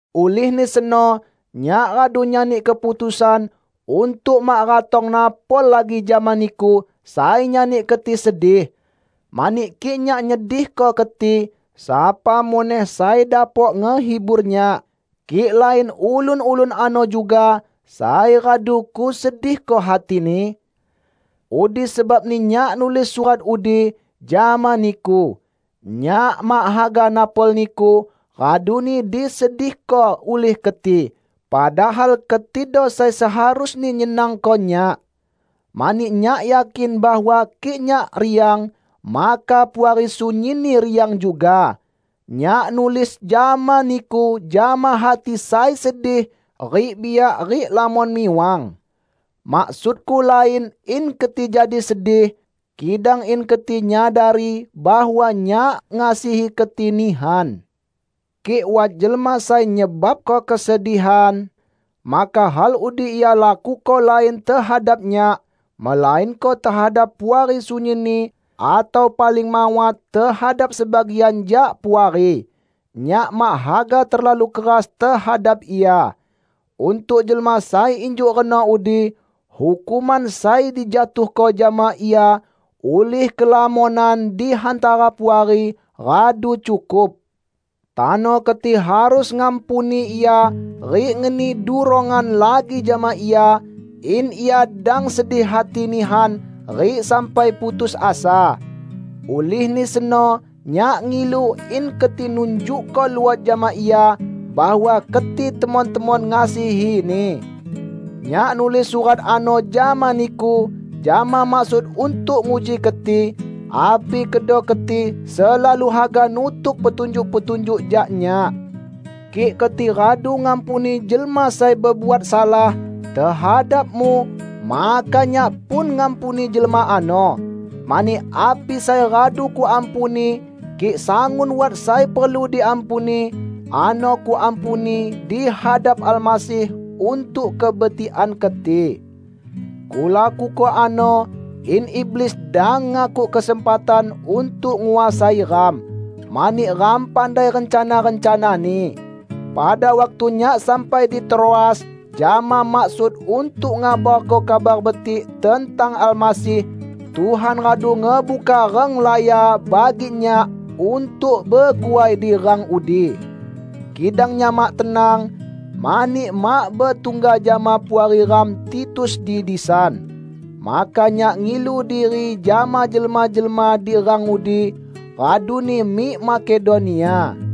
Ulihni seno nyak radu nyani keputusan untuk mak ratong napol lagi jama niku sai nyani keti sedih. Mani kik nyak nyedihko keti, sapa muneh sai dapok ngehibur nyak, kik lain ulun-ulun ano juga sai radu kusedihko hatini? Udi sebabni nyak nulis surat udi, jama niku. Nyak mak haga napol niku, raduni disedihko ulih keti padahal ketido sai seharusni nyenangko nyak. Mani nyak yakin bahwa kik nyak riang, maka Puari sunyinni riang juga. Nyak nulis jama niku jama hati sai sedih rik biak rik lamon miwang. Maksudku lain in keti jadi sedih, kidang in keti nyadari bahwa nyak ngasihi keti nihan. Kik wat jelma sai nyebabko kesedihan, maka hal udi ia lakuko lain tehadap nyak, melainko tehadap Puari sunyinni atau paling mawat tehadap sebagian jak Puari. Nyak mak haga terlalu keras tehadap ia. Untuk jelma sai injuk reno udi, hukuman sai dijatuhko jama ia ulih kelamonan di hantara Puari, radu cukup. Tano keti harus ngampuni ia rik ngeni durongan lagi jama ia in ia dang sedih hati nihan rik sampai putus asa. Ulihni seno nyak ngilu, in keti nunjukko luot jama ia bahwa keti temon-temon ngasihini. Nyak nulis surat ano jama niku jama maksud untuk nguji keti, api kedo keti selalu haga nutuk petunjuk-petunjuk jak nyak. Kik keti radu ngampuni jelma sai bebuat salah tehadapmu maka nyak pun ngampuni jelma ano. Mani api sai radu kuampuni -- kik sangun wat sai perlu diampuni -- ano kuampuni di hadap Almasih untuk kebetikan keti. Kulakuko ano in iblis dang ngakuk kesempatan untuk nguasai ram, mani ram pandai rencana-rencanani. Pada waktu nyak sampai di Troas jama maksud untuk ngabarko Kabar Betik tentang Almasih, Tuhan radu ngebuka renglaya bagi nyak untuk beguai di rang udi. Kidang nyak mak tenang mani mak betungga jama puari ram Titus di disan. Maka nyak ngilu diri jama jelma-jelma di rang udi raduni mik Makedonia.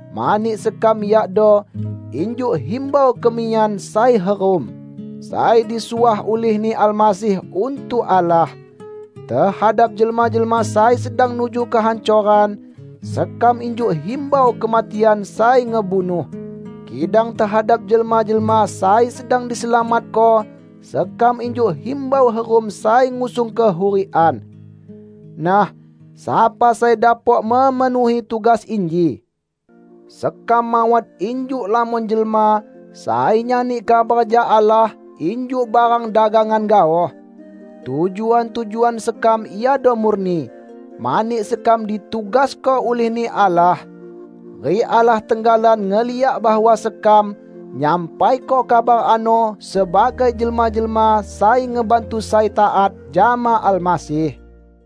Mani sekam yakdo injuk himbau kemiyan sai herum; sai disuah ulih-Ni Almasih untuk Allah. Tehadap jelma-jelma sai sedang nuju kehancoran, sekam injuk himbau kematian sai ngebunuh, kidang tehadap jelma-jelma sai sedang diselamatko, sekam injuk himbau herum sai ngusung kehurikan. Nah, sapa sai dapok memenuhi tugas inji? Sekam mawat injuk lamon jelma sai nyani kabar jak Allah injuk barang dagangan gaoh. Tujuan-tujuan sekam iado murni, mani sekam ditugasko ulih-Ni Allah. Rik Allah tenggalan ngeliak bahwa sekam nyampaiko kabar ano sebagai jelma-jelma sai ngebantu sai taat jama Almasih.